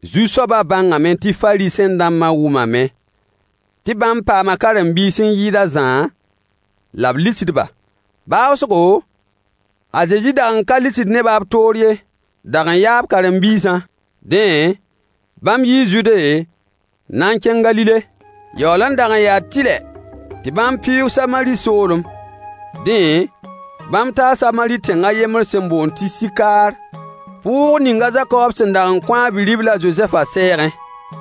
Zu-soabã bãngame tɩ Fariisẽ-dãmbã wʋmame tɩ bãmb paama karen-biis n yɩɩd a Zã, la b lisd-ba. Baoosgo, a Zezi dag n ka lisd nebã b toor ye, dag n yaa b karen-biisã. Dẽ, bãmb yii Zude n na n kẽng Galile. Yaool n dag n yaa tɩlɛ tɩ bãmb pɩʋʋg Samari soolem. Dẽ, bãmb taa Samari tẽng a yembr sẽn boond tɩ Sɩkaar, pʋʋg ning a Zakob sẽn dag n kõ a bi-ribl a Zozɛfã sɛɛgẽ.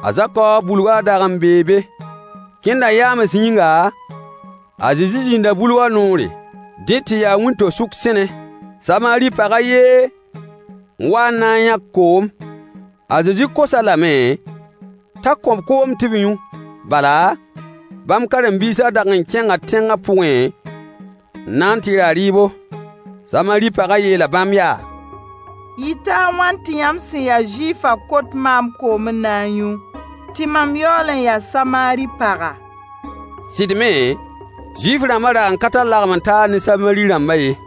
A Zakob bulgã dag n bee be. Kẽndã yaams yĩnga, a Zezi zĩnda bulgã noore. Dẽ tɩ yaa wĩnto-sʋk sẽne. Samari pag a yen n wa n na n yãk koom. A Zezi kos-a lame t'a kõ-b koom tɩ b yũ. Bala, bãmb karen-biisã dag n kẽnga tẽngã pʋgẽ n na n tɩ ra rɩɩbo. Samari pagã yeela bãmb yaa: Yɩta a wãn tɩ yãmb sẽn ya Zuifã kot maam, koom n na n yũ? Tɩ mam yaool n ya Samari paga. — Sɩd me, Zuif-rãmbã dag n ka tar lagem-n-taar ne Samari rãmbã ye.—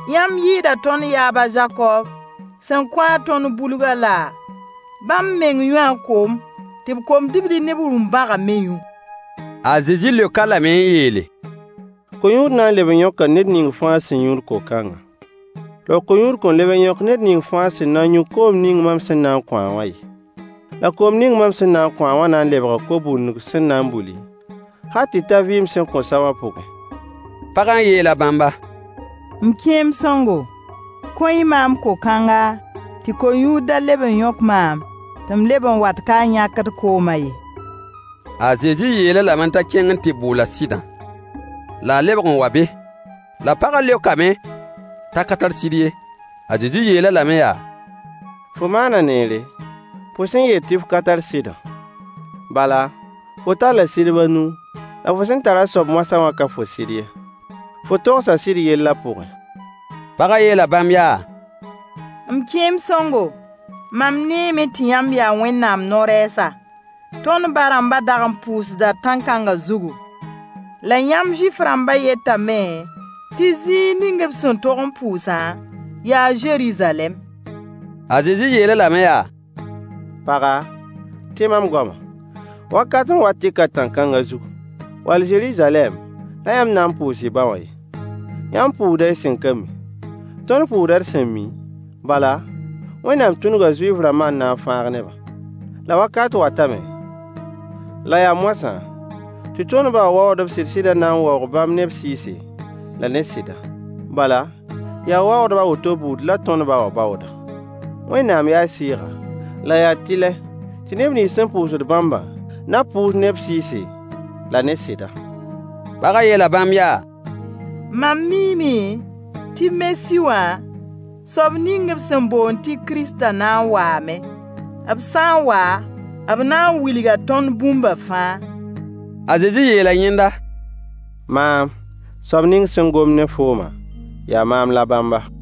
Yãmb yɩɩda tõnd yaab a Zakob, sẽn kõ-a tõnd bulgã laa? Bãmb meng yũu a koom, tɩ b kom-dibli ne b rũm-bãgã me yũ. A Zezi leok-a lame n yeele: Ko-yũud na n leb n yõka ned ning fãa sẽn yũud ko-kãngã. La ko-yũud kõn leb n yõk ned ning fãa sẽn na n yũ koom ning mam sẽn na n kõ-a wã ye, la koom ning mam sẽn na n kõ-a wã na n lebga ko-bundg sẽn na n buli, hal tɩ ta vɩɩm sẽn kõn sa wã pʋgẽ. Pagã yeela bãmba: M kẽem sõngo, kõ-y maam ko-kãnga, tɩ ko-yũud da leb n yõk maam, tɩ m leb n wat ka n yãkd koomã ye. A Zezi yeel-a lame t'a kẽng n tɩ bool a sɩdã, la a lebg n wa be. La pagã leokame t'a ka tar sɩd ye. A Zezi yeel-a lame yaa: Fo maana neere, fo sẽn yeel tɩ f ka tar sɩdã. Bala, fo talla sɩdb a nu, la fo sẽn tar a soab moasã wã ka fo sɩd ye. Fo togsa sɩd yellã pʋgẽ. Pagã yeela bãmb yaa: M kẽem sõngo, mam neeme tɩ yãmb yaa Wẽnnaam no-rɛɛsa. Tõnd ba-rãmbã dag n pʋʋsda tãn-kãngã zugu. La yãmb Zuif-rãmbã yetame tɩ zĩig ning b sẽn tog n pʋʋsã yaa Zeruzalɛm. A Zezi yeel-a lame yaa: Paga, tẽ mam goamã! Wakat n wat tɩ ka tãn-kãngã zug wall Zeruzalɛm la yãmb na n pʋʋs y ba wã ye. Yãmb pʋʋsda y sẽn ka mi. Tõnd pʋʋsda d sẽn mi, bala, Wẽnnaam tũnuga Zuif-rãmbã n na n fãag nebã. La wakat watame — la yaa moasã — tɩ tõnd ba wã waoogdb sɩd-sɩdã na n waoog bãmb ne b sɩɩse la ne sɩda. Bala, yaa waoogdb a woto buud la tõnd ba wã baooda. Wẽnnaam yaa Sɩɩga, la yaa tɩlɛ tɩ neb nins sẽn pʋʋsd bãmbã na pʋʋs ne b sɩɩse, la ne sɩda. Pagã yeela bãmb yaa: Mam miime tɩ Mesi wã, soab ning b sẽn boond tɩ Kiristã na n waame. B sã n wa, b na n wilga tõnd bũmba fãa. A Zezi yeela yẽnda: Maam, soab ning sẽn gomd ne fooma, yaa maam la bãmba.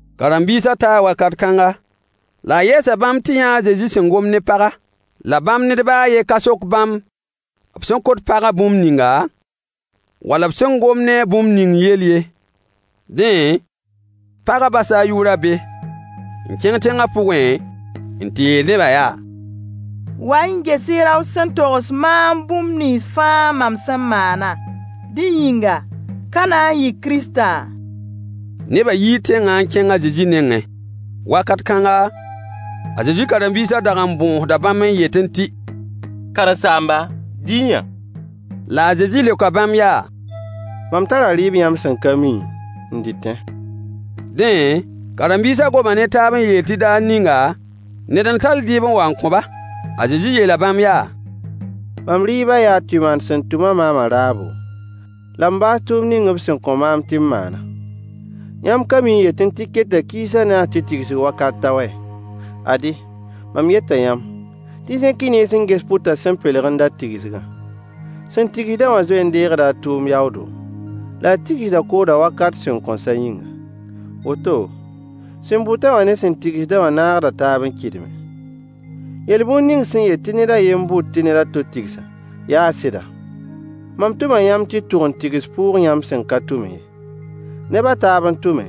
Karen-biisã taa wakat kãnga, la a yɛɛsa bãmb tɩ yã a Zezi sẽn gomd ne paga, la bãmb ned baa a yen ka sok bãmb b sẽn kot pagã bũmb ninga, wall b sẽn gomd ne-a bũmb ning yell ye. Dẽ, pagã basa a yʋʋrã be, n kẽng tẽngã pʋgẽ n tɩ yeel nebã yaa: Wa-y n ges-y rao sẽn togs maam bũmb nins fãa mam sẽn maanã! Dẽ yĩnga, ka na n yɩ Kiristã? Nebã yii tẽngã n kẽng a Zezi nengẽ. Wakat kãnga, a Zezi karen-biisã dag n bõosda bãmb n yetẽ tɩ: Karen-saamba, dɩ-y-yã. La a Zezi leoka bãmb yaa: Mam tara rɩɩb yãmb sẽn ka mi, n dɩtẽ. Dẽ, karen-biisã goma ne taab n yeel tɩ daar ninga ned n tall rɩɩb n wa n kõ-ba. A Zezi yeela bãmb yaa: Mam rɩɩba, yaa tɩ maan sẽn tʋm-a maamã raabo, la m baas tʋʋmd ning b sẽn kõ maam tɩ m maanã. Yãmb ka mi n yetẽ tɩ keta kiis a naas tɩ tigsg wakat ta wɛ? Ad-y, mam yeta yãmb tɩ y zẽk y nens n ges pʋtã sẽn pelg n dat tigsgã. Sẽn tigsd-a wã zoe n deegda a tʋʋm yaoodo, la a tigsda koodã wakat sẽn kõn sa yĩnga. Woto, sẽn bʋt-a wã ne sẽn tigsd-a wã naagda taab n kɩdme. Yel-bũnd ning sẽn yet tɩ ned a yen n bʋt tɩ ned a to tigsã, yaa sɩda. Mam tʋma yãmb tɩ y tʋg n tigs pʋʋg yãmb sẽn ka tʋmẽ ye. Neb a taab n tʋme,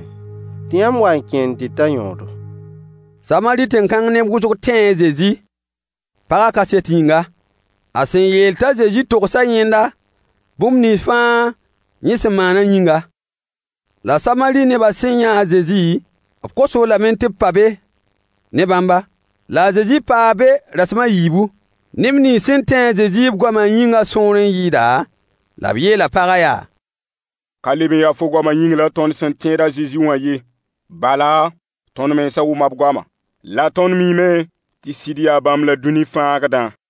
tɩ yãmb wa n kẽ n dɩt a yõodo. Samari tẽn-kãng neb wʋsg tẽe a Zezi, pagã kaset yĩnga, a sẽn yeel t'a Zezi togsa yẽnda bũmb nins fãa yẽ sẽn maanã yĩnga. La Samari nebã sẽn yã a Zezi, b kos-b lame tɩ b pa ne bãmba. La a Zezi paa be rasem a yiibu. Neb nins sẽn tẽ a Zezi b goamã yĩngã sõor n yɩɩda, la b yeela pagã yaa: Ka leb n ya fo goamã yĩng la tõnd sẽn tẽed a Zezi wã ye. Bala, tõnd mensã wʋma b goamã, la tõnd miime tɩ sɩd yaa bãmb la dũni fãagdã.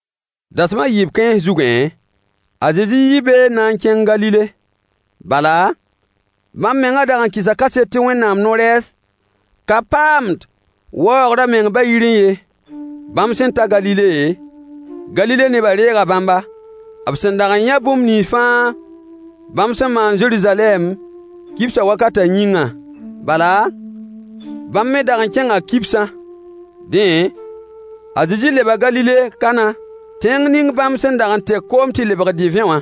Dasem a yiib kãens zugẽ, a Zezi yii be n na n kẽng Galile, bala, bãmb mengã dag n kɩsa kaset tɩ Wẽnnaam no-rɛɛs ka paamd waoogr a meng ba-yirẽ ye. Bãmb sẽn ta Galile, Galile nebã reega bãmba, b sẽn dag n yã bũmb nins fãa bãmb sẽn maan Zeruzalɛm, kibsã wakatã yĩngã. Bala, bãmb me dag n kẽnga kibsã. Dẽ, a Zezi leba Galile Kana, tẽng ning bãmb sẽn dag n tek koom tɩ lebg divẽ wã.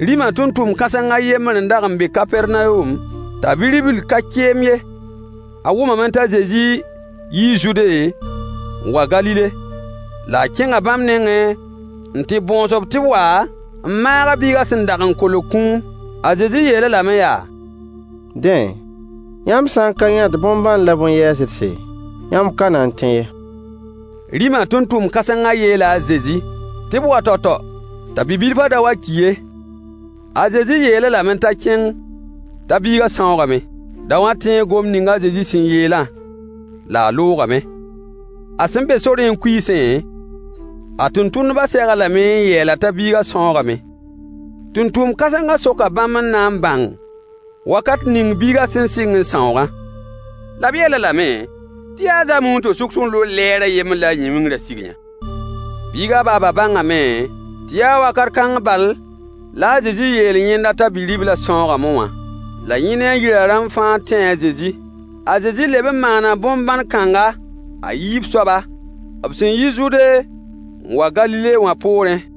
Rĩma tʋmtʋmd kãseng a yembr n dag n be Kapɛrnawom, t'a bi-ribl ka keem ye. A wʋmame t'a Zezi yii Zude n wa Galile, la a kẽnga bãmb nengẽ n tɩ bõos-b tɩ b wa n maag a biigã sẽn dag n kolg kũum. A Zezi yeel-a lame yaa: Dẽ, yãmb sã n ka yãt bõn-bãn la bõn-yɛɛsdse, yãmb ka na n tẽ ye. Rĩmã tʋmtʋmd kãsengã yeela a Zezi tɩ b wa tao-tao t'a bi-bilfã da wa ki ye. A Zezi yeel-a lame t'a kẽng t'a biigã sãoogame. Daowã tẽe gomd ning a Zezi sẽn yeelã, la a loogame. A sẽn be sorẽ n kuiisẽ, a tʋmtʋmdbã seg-a lame n yeel-a t'a biigã sãoogame. Tʋmtʋmd-kãsengã soka bãmb n na n bãng wakat ning biigã sẽn sɩng n sãoogã. La b yeel-a lame tɩ yaa zaame wĩnto-sʋk sẽn loog lɛɛr a yembr la a yĩn-wɩngrã sig-yã. Biigã baaba bãngame tɩ yaa wakat kãng bal la a Zezi yeel yẽnda t'a bi-riblã sãoogame wã. La yẽ ne a yirã rãmb fãa tẽe a Zezi. A Zezi leb n maana bõn-bãn kãnga, a yiib soaba, b sẽn yi Zude n wa Galile wã poorẽ.